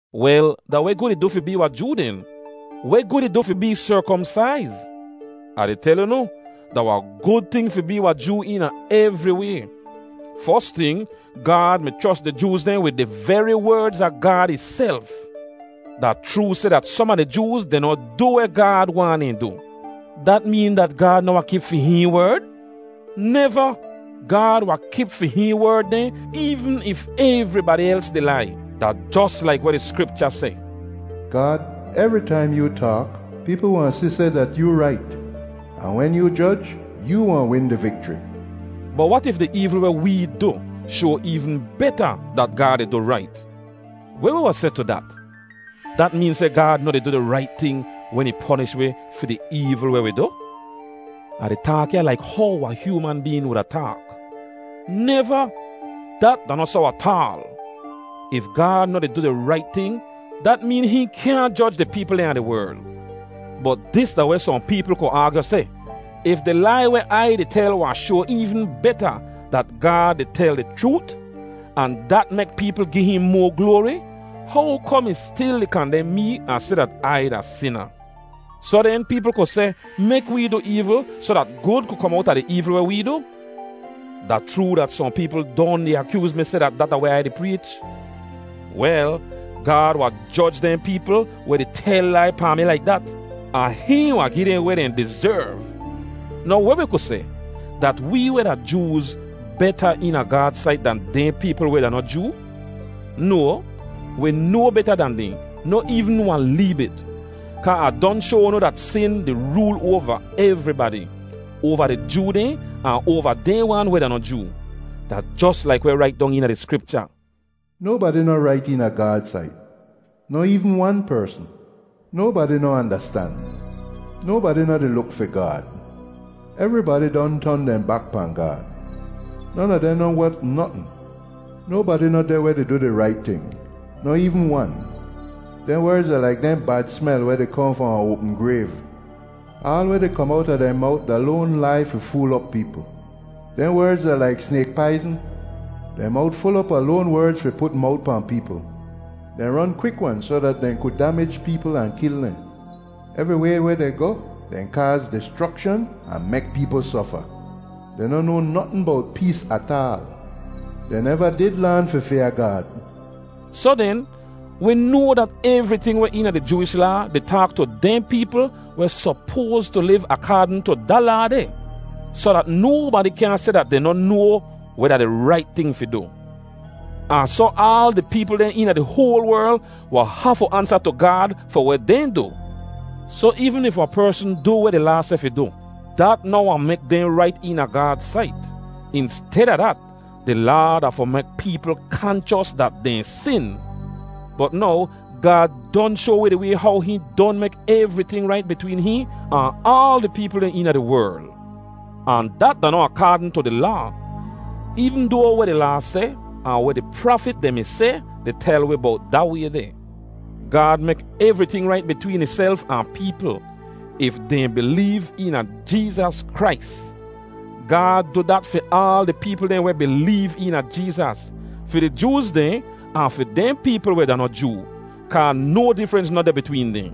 Wel, da weh gud ih du fi bee wahn Joo den? Weh gud ih du fi bee serkomsaiz? Ah di tel unu, da wahn gud ting fi bee wahn Joo eena evri way. Fos ting, Gaad mi chros di Jooz dehn wid di veri werdz a Gaad ihself. Da chroo seh dat som a di Jooz dehn noh du weh Gaad waahn dehn du. Dat meen dat Gaad noh wahn kip fi hihn werd? Neva! Gaad wahn kip fi hihn werd dehn eevn if evribadi els di lai. Da jos laik weh di Skripcha seh, “Gaad, evri taim yoo taak, peepl wahn si seh dat yoo rait. Ahn wen yoo joj, yoo wahn win di vikchri.” Bot wat if di eevl weh wee du shoa eevn beta dat Gaad di du rait? Weh wi wahn seh tu dat? Dat meen seh Gaad noh di du di rait ting wen ih ponish wi fi di eevl weh wi du? (Ah di taak ya laik how wahn hyooman been wuda taak.) Neva! Dat da noh soh ataal! If Gaad noh di du di rait ting, dat meen hihn kyaahn joj di peepl dehn a di werl. Bot dis da weh sohn peepl ku aagyu seh: “If di lai weh Ai di tel wahn shoa eevn beta dat Gaad di tel di chroot, ahn dat mek peepl gi hihn moa gloari, how kom ih stil di kandem mee ahn seh dat Ai da sina?” Soh den, peepl ku seh, “Mek wee du eevl soh dat gud ku kom owta di eevl weh wee du.” Da chroo dat sohn peepl don di akyooz mi seh dat dat da weh Ai di preech. Wel, Gaad wahn joj dehn peepl weh di tel lai pahn mi laik dat, ahn hihn wahn gi dehn weh dehn dizerv. Now weh wi ku seh, dat wee weh da Jooz beta eena Gaad sait dan dehn peepl weh da noh Joo? No, wi no beta dan dehn, noh eevn wahn lee bit. Kaa Ah don shoa unu dat sin di rool oava evribadi, oava di Joo dehn ahn oava dehn wan weh da noh Joo. Da jos laik weh rait dong eena di Skripcha, “Nobadi noh rait eena Gaad sait, noh eevn wan persn. Nobadi noh andastan. Nobadi noh di luk fi Gaad. Evribadi don ton dehn bak pahn Gaad. Non a dehn noh wot notn. Nobadi noh deh weh di du di rait ting, noh eevn wan.” “Dehn werdz da laik dehn bad smel weh di kohn fahn wahn oapm grayv. Aal weh di kom owta dehn mowt da loan lai fi fool op peepl.” “Dehn werdz da laik snayk paizn.” “Dehn mowt ful op a loan werdz fi put mowt pahn peepl.” “Dehn ron kwik-wan soh dat dehn ku damij peepl ahn kil dehn. Evriway weh dehn goh, dehn kaaz dischrokshan ahn mek peepl sofa. Dehn noh noa notn bowt pees ataal.” “Dehn neva did laan fi fyaa Gaad.” Soh den, wi noa dat evriting weh eena di Jooish Laa di taak tu dehn peepl weh sopoas tu liv akaadn tu da Laa deh, soh dat nobadi kyaahn seh dat dehn noh noa weh da di rait ting fi du. Ahn soh aal di peepl dehn eena di hoal werl wahn hafu ansa tu Gaad fi weh dehn du. Soh eevn if wahn persn du weh di Laa seh fi du, dat noh wahn mek dehn rait eena Gaad sait. Insteda dat, di Laa da fi mek peepl kanchos dat dehn sin. Bot now Gaad don shoa wi di way how hihn don mek evriting rait bitween hihn ahn aal di peepl dehn eena di werl. Ahn dat da noh akaadn tu di Laa, eevn doa weh di Laa seh, ahn weh di prafit dehn mi seh di tel wi bowt da way deh. Gaad mek evriting rait bitween ihself ahn peepl if dehn bileev eena Jeezas Krais. Gaad du dat fi aal di peepl dehn weh bileev eena Jeezas, fi di Jooz dehn ahn fi dehn peepl weh da noh Joo, kaa no difrens noh deh bitween dehn.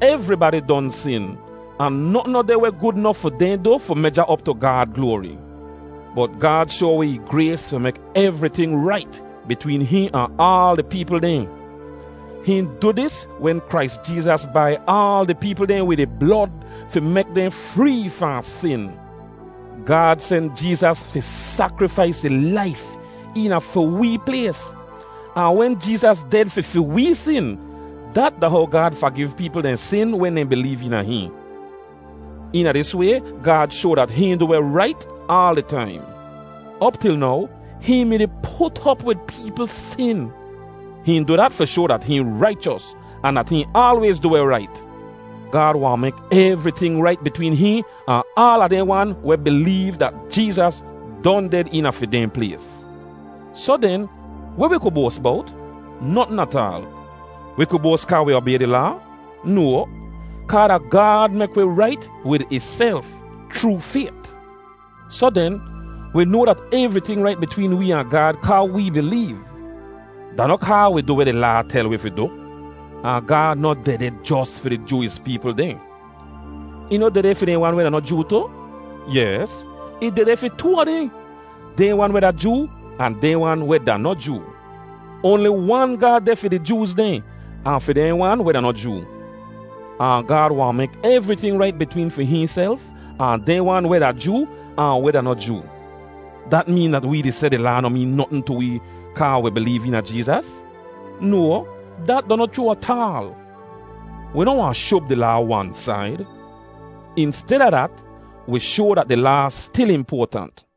Evribadi don sin, ahn notn noh deh weh gud nof fi dehn du fi meja op tu Gaad gloari. Bot Gaad shoa wi ih grays fi mek evriting rait bitween hihn ahn aal di peepl dehn. Hihn du dis wen Krais Jeezas bai aal di peepl dehn wid ih blod fi mek dehn free fahn sin. Gaad sen Jeezas fi sakrifais ih laif eena fi wee plays, ahn wen Jeezas ded fi fi wee sin, dat da how Gaad fagiv peepl dehn sin wen dehn bileev eena hihn. Eena dis way Gaad shoa dat hihn du weh rait aal di taim. Op til now hihn mi-di put op wid peepl sin. Hihn du dat fi shoa dat hihn raichos ahn dat hihn aalwayz du weh rait. Gaad wahn mek evriting rait bitween hihn ahn aala dehn wan weh bileev dat Jeezas don ded eena fi dehn plays. Soh den, weh wi ku boas bowt? Notn ataal. Wi ku boas kaa wi obay di Laa? No, kaa da Gaad mek wi rait wid ihself chroo fayt. Soh den, wi noa dat evriting rait bitween wee ahn Gaad kaa wee bileev. Da noh kaa wi du weh di Laa tel wi fi du. Ahn Gaad noh dehdeh jos fi di Jooish peepl dehn. Ih noh dehdeh fi dehn wan weh da noh Joo tu? Yes, ih dehdeh fi di too a dehn, dehn wan weh da Joo, ahn dehn wan weh da noh Joo. Oanli wan Gaad deh fi di Jooz dehn, ahn fi dehn wan weh da noh Joo. Ahn Gaad wahn mek evriting rait bitween fi hihnself ahn dehn wan weh da Joo ahn weh da noh Joo. Dat meen dat wee di seh di Laa noh meen notn tu wee kaa wi bileev eena Jeezas? No, dat da noh chroo ataal. Wi noh wahn shub di Laa wan said. Insteda dat, wi shoa dat di Laa stil impoatant.